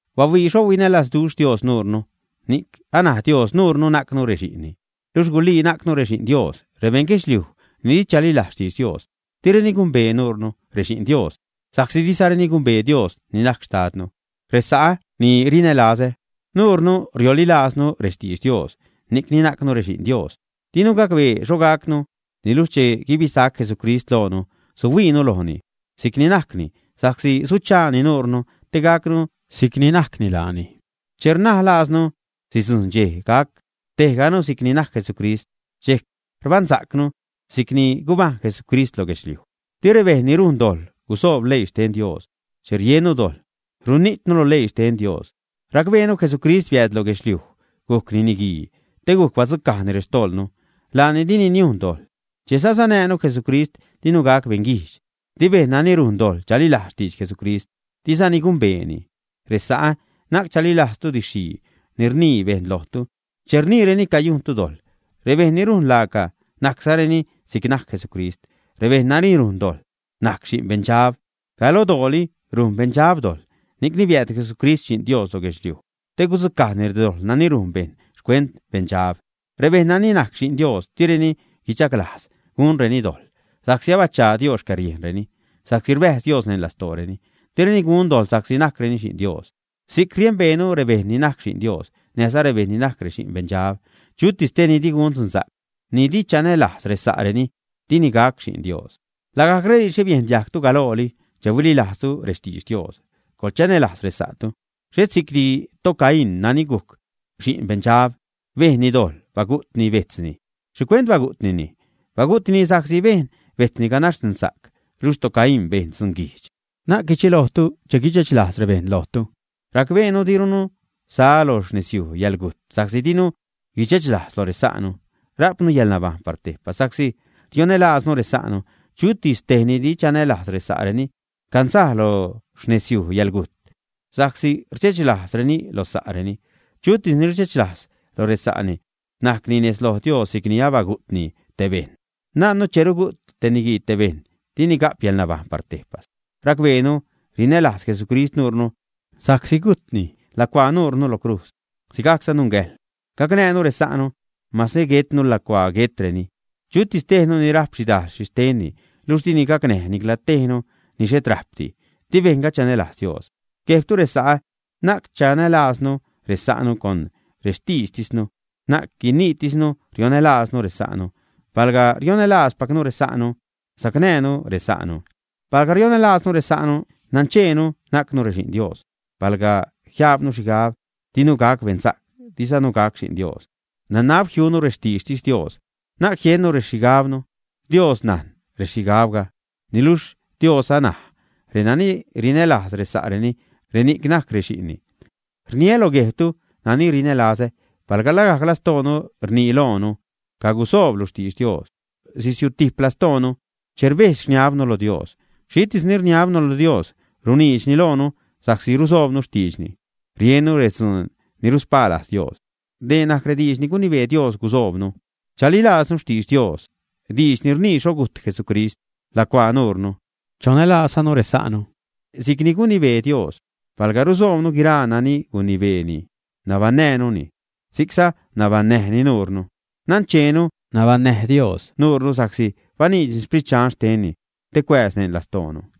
Bahuii xho huinälazduxh Dios nuure, ni'c anaj Dios nuure najcnu rexi'nni. Luxh gulii najcnu rexi'n Dios. Rebeṉ guedxliuj ni di chalilajz xtidx Dios, direni gumbee nuure, rexi'n Dios, sa'csi dizareni gumbee Dios ni najc xtadnu. Resa'ä ni rinälazä, nuunu riolilaaznu rextidx Dios, ni'cni najcnu rexi'n Dios. Dinu gacbee xho gacnu niluxh che guibisac Jesucrist loonu, suhuiinu lojni si'c ni najcni, sa'csi suchaani nuure te gacnu si'c ni najcni laani. Che rnaj laaznu sidzujṉ dxej gac tejganu si'c ni najc Jesucrist, dxejc rbaṉsa'cnu si'c ni gubajṉ Jesucrist lo guedxliuj. Di rebejṉ ni rujn dojḻ gusoob leii xten Dios. Che riennu dojḻ, runijtnu lo leii xten Dios. Racbeenu Jesucrist biääd lo guedxliuj, gujcni niguii te gujc badzucajni rextojḻnu. Laani dini niujn dojḻ. Che sasanäjnu Jesucrist, dinu gac beṉguijdx. Di bejṉ nani rujn dojḻ chalilajz xtidx Jesucrist, dizani gumbeeni. Resa'ä, na'c chalilajztu didx-xhii ni rnii bejṉ lojtu, che rniireni cayujntu dojḻ. Rebejṉ ni rujn laaca, najczareni si'c najc Jesucrist. Rebejṉ nani rujn dojḻ najc xi'n beṉdxab. Galodooli rujn beṉdxab dojḻ. Ni'cni biääd Jesucrist Xi'n Dios lo guedxliuj te gudzucajni redojḻ nani rujn bejṉ xcuent beṉdxab. Rebejṉ nani najc xi'n Dios direni guichaglajz gunreni dojḻ, sa'csi abachaa Dios xcäriejnreni, sa'csi rbäjz Dios neṉ lastooreni. Direni gun dojḻ, sa'csi najcreni xi'n Dios. Si'c riembeenu rebejṉ ni najc xi'n Dios, näjza rebejṉ ni najc rexi'n beṉdxab. Chutis tejni di gun dzunsa'c, ni dini chanälajz resa'reni, dini gac xi'n Dios. Lagajc rediidxre biejn diajgtu galooli che huililajztu rextidx Dios: coḻchanälajz resa'tu. Xhet si'cdi toCain nani gujc xi'n beṉdxab. Bejnni dojḻ, bagu'tni bejtzni. ¿Xhicuent bagu'tnini? Bagu'tnini sa'csi bejn bejtzni ganax dzunsa'c, luxh toCain bejn dzunguijdx. Na'c guidxelojtu che guidxechlajz rebejṉ lojtu. Racbeenu dirunu sa lo xnezyuj yäḻgujt, sa'csi dinu guidxechlajz loj resa'nu. Rajpnu yäḻnabajṉ par tejpas sa'csi rionälaaznu resa'nu. Chutis tej ni di chanälajz resa'reni canzaj lo xnezyuj yäḻgujt, sa'csi rdxechlajzreni lo sa'reni. Chutis ni rdxechlajz lo resa'ni, najcni nejz lo Dios si'c ni abagu'tni te bejṉ. Najnnu che rugu't te niguii te bejṉ dini ga'p yäḻnabajṉ par tejpas. Racbeenu rinälajz Jesucrist nuunu, sa'csi gujtni lacuaa nuunu lo crujz. Sigajcza nungäjḻ gacnäjnu resa'nu, mase guetnu lacuaa guetreni. Chutis tejnu ni rajp xhidajl xhixtenni, luxh dini gacnäj nicla tejnu ni xhet rajpdi, di bejṉga chanälajz Dios. Guejbtu resa'ä, na'c chanälaaznu resa'nu con rextiidxtisnu, na'c guiniitisnu rionälaaznu resa'nu. Palga rionälaazpacnu resa'nu, sacnäjnu resa'nu. Palga rionälaaznu resa'nu, nancheenu najcnu rexi'n Dios. Palga jiajbnu xhigab dinu gac beṉsa'c, dizanu gac xi'n Dios, nanab jiunu rextiidxtis Dios, na'c jiunu rexhigabnu. Dios najn rexhigabga. Niluxh Dios anaj: renani rinälaaz resa'reni, reni'c najc rexi'nni. Rniä lo guejbtu nani rinälazä, palga lagajc lastoonu rnii loonu, “cagusooblu xtidx Dios”, sisiutijp lastoonu che rbedx-rniabnu lo Dios. Xhitis ni rniabnu lo Dios, runiidxni loonu sa'csi rusoobnu xtiidxni, riennu redzuun ni ruspaa lajz Dios. Dee najc rediidx ni gunibee Dios gusoobnu: chalilaaznu xtidx Dios, diidx ni rnii xho gujt Jesucrist lacuaa nuunu, chonälaazzanu resa'nu si'cni gunibee Dios. Palga rusoobnu guiraa nani gunibeeni, nabaṉnäjnuni, si'cza nabaṉnäjni nuunu. Nancheenu nabaṉnäj Dios nuunu, sa'csi baniidxni Sprit Dxan xtenni te cuääz neṉ lastoonu.